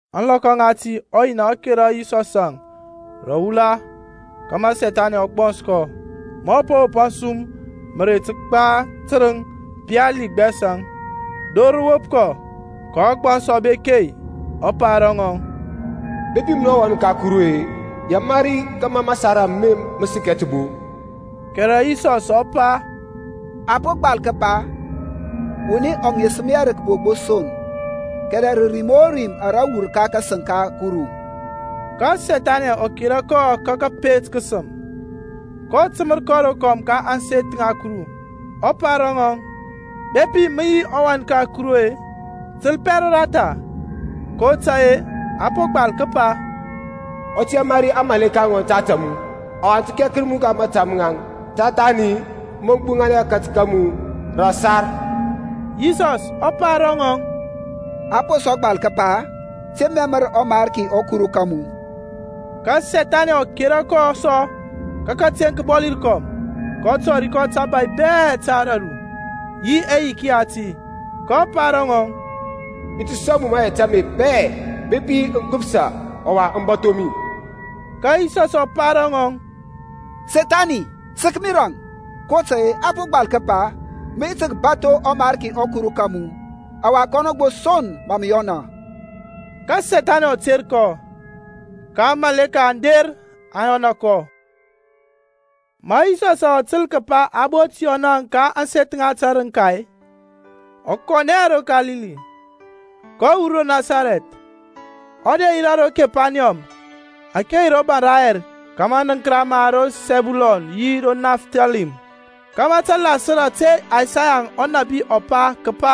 Ȧŋlɔkɔ ŋati ɔYina ɔ kera Yisɔsȧŋ ro wula kȧmȧ Sethani ɔ gbɔns kɔ. Ma ɔ po wop asum mǝrei tǝgba tǝrǝŋ pali gbɛsȧŋ, dor rǝ wop kɔ. Ka ɔgbɔns ɔ bek-e, ɔ pa ro ŋɔŋ, Bepi munɔ yi ɔWan ka Kuru-e, yamari kȧmȧ masar ame mǝ sǝkɛ tǝbo. Kɛrɛ Yisɔs ɔ pa, A po gbal kǝpa, Wuni ɔ ŋesǝm hɛ rǝ kǝbo gbo son, kɛrɛ rǝ rim o rim ara wur ka kasǝŋ ka Kuru. Ka Sethaniȧŋ ɔ kera kɔ ka kȧpet kǝsǝm, kɔ tǝmǝr kɔ rokɔm ka ȧŋseth ŋa Kuru, ɔ pa ro ŋɔŋ, Bepi mǝ yi ɔWan ka Kuru-e, tǝlpɛ roratha, kotȧy-e a po gbal kǝpa, Ɔ tǝ yamari aŋmȧleka ŋɔŋ ta ȧtȧ mu, Ɔwa aŋ tǝ kɛkǝr mu ka mȧta maŋ Ta thani mǝ gbuŋanɛ akatǝk ka mu rǝ ȧsar. Yisɔs ɔ pa ro ŋɔŋ, A po sɔ gbal kǝpa, Te mɛmǝr ɔMarki ɔKuru ka mu. Ka Sethaniȧŋ ɔ kera kɔ sɔ ka kǝteŋ kǝbɔli rǝkɔm, kɔ tɔri kɔ tabȧy bɛ ta ȧdȧru, yi ɛyiki yati. kɔ pa ro ŋɔŋ, I ti sɔŋ mu mayɛt ame bɛ-e bepi mǝ gbǝpsa, ɔwa mǝ bȧtho mi. Ka Yisɔs ɔ pa ro ŋɔŋ, Sethani, sək mi rȧŋ! kotȧy-e a po gbal kǝpa, Mǝ yi tǝ kǝbatho ɔMarki ɔKuru ka mu, ɔwa kɔnɔ gbo son mǝ mǝ yɔna. Ka Sethaniȧŋ ɔ ter kɔ, ka aŋmȧleka aŋ der aŋ yɔna kɔ. Ma Yisɔsȧŋ ɔ tǝl kǝpa a bot Yɔnȧŋ ka ȧŋseth ŋa tǝrǝŋka-e, ɔ kɔnɛ ro Kalili. kɔ wur ro Nasarɛth, ɔ der yirȧ ro Kepaniyɔm ȧke yi ro baŋ rayɛr, ka mȧnǝnkǝra ma ro Sɛbulɔn yi Nafthalim. Kama tǝ lasǝr ȧte Isaya ɔnȧbi ɔ pa, kǝpa,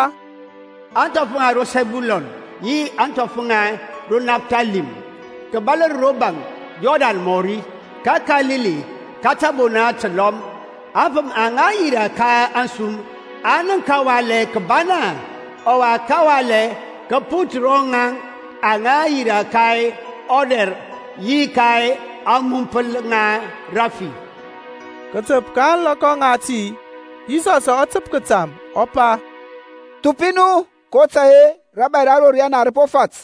Aŋthɔf ŋa ro Sɛbulɔn, yi ȧŋthɔf ŋa ro Nafthalim, Kǝbalǝr ro baŋ Yɔrdan mɔri, Ka Kalili ka tȧbona tǝlɔm, Aŋfǝm aŋa yirȧ ka ȧŋsum Aŋ nənk kǝwalɛ kǝbana; Ɔwa kǝwalɛ kǝ put ro ŋaŋ Aŋa yirȧ ka ɔdɛr yi ka ȧŋmumpǝl ŋa rǝfi. Kǝtəp ka ȧŋlɔkɔ ŋati Yisɔsȧŋ ɔ tǝp kǝtam, ɔ pa, Thupi nu kotȧy-e rȧbȧy ra ro riyana rǝ po fat.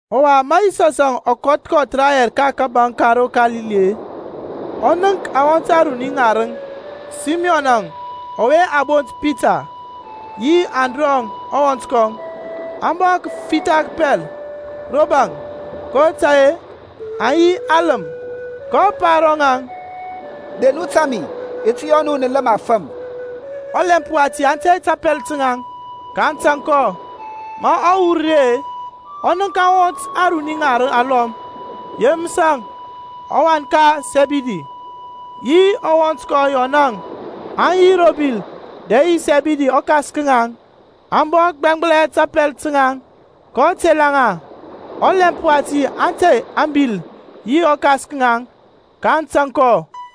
Ɔwa ma Yisɔsȧŋ ɔ kɔth kɔth rayɛr ka kȧbȧŋ ka ro Kalili-e ɔ nənk awɔnt aruni ŋarǝŋ, Symɔnȧŋ ɔwe a bont Pita, yi Andrɔŋ ɔwɔnt kɔŋ, aŋ bɔ fitha kǝpɛl ro baŋ, kotȧy-e aŋ yi alǝm. kɔ pa ro ŋaŋ, De nu tȧŋ mi, i ti yɔ nu nǝ lǝm afǝm. Ɔlɛmp wati aŋ tey tapɛl ta naŋ, kaŋ tȧŋ kɔ. Ma ɔ wur ri-e, ɔ nənk awɔnt aruni ŋarǝŋ alɔm, Yemǝsȧŋ ɔwan ka Sɛbidi, yi ɔwɔnt kɔŋ Yɔnȧŋ, aŋ yi ro bil dɛ yi Sɛbidi ɔkas ka ŋaŋ, aŋ bɔ gbɛŋgbǝlɛ tapɛl taŋ. Kɔ tela ŋa. Ɔlɛmp wati aŋ tey ȧŋbil yi ɔkas ka ŋaŋ, kaŋ tȧŋ kɔ.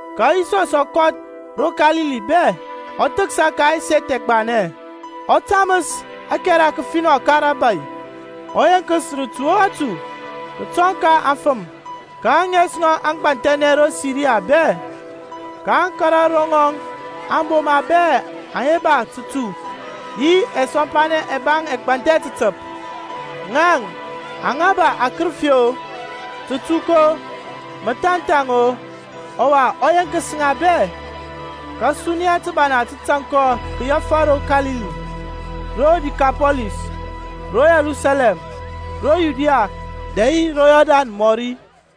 Ka Yisɔsȧŋ ɔ kɔth ro Kalili bɛ, ɔ thǝksa ka ɛseth ɛgbanɛ, ɔ tamǝs ȧkɛra kǝfinɔ ka rȧbȧy, ɔ yeŋkǝs rǝtu o rǝtu kətɔŋ ka aŋfəm. Ka ȧŋes ŋɔŋ aŋ gbanthɛnɛ ro Siria bɛ; kaŋ kȧrȧ ro ŋɔŋ aŋboma bɛ aŋa ba tǝtu yi ɛsɔmpanɛ ɛbaŋ ɛgbanthɛ tǝtǝp, ŋaŋ aŋa ba akǝrǝfi-o, tatuk-o, mȧthanthaŋ-o, ɔwa ɔ yeŋkǝs ŋa bɛ. Ka suniya tǝbana tǝ tȧŋ kɔ kǝyɛfȧ ro Kalili, ro Dikapɔlis, ro Yerusalɛm, ro Yudia dɛ yi ro Yɔrdan mɔri.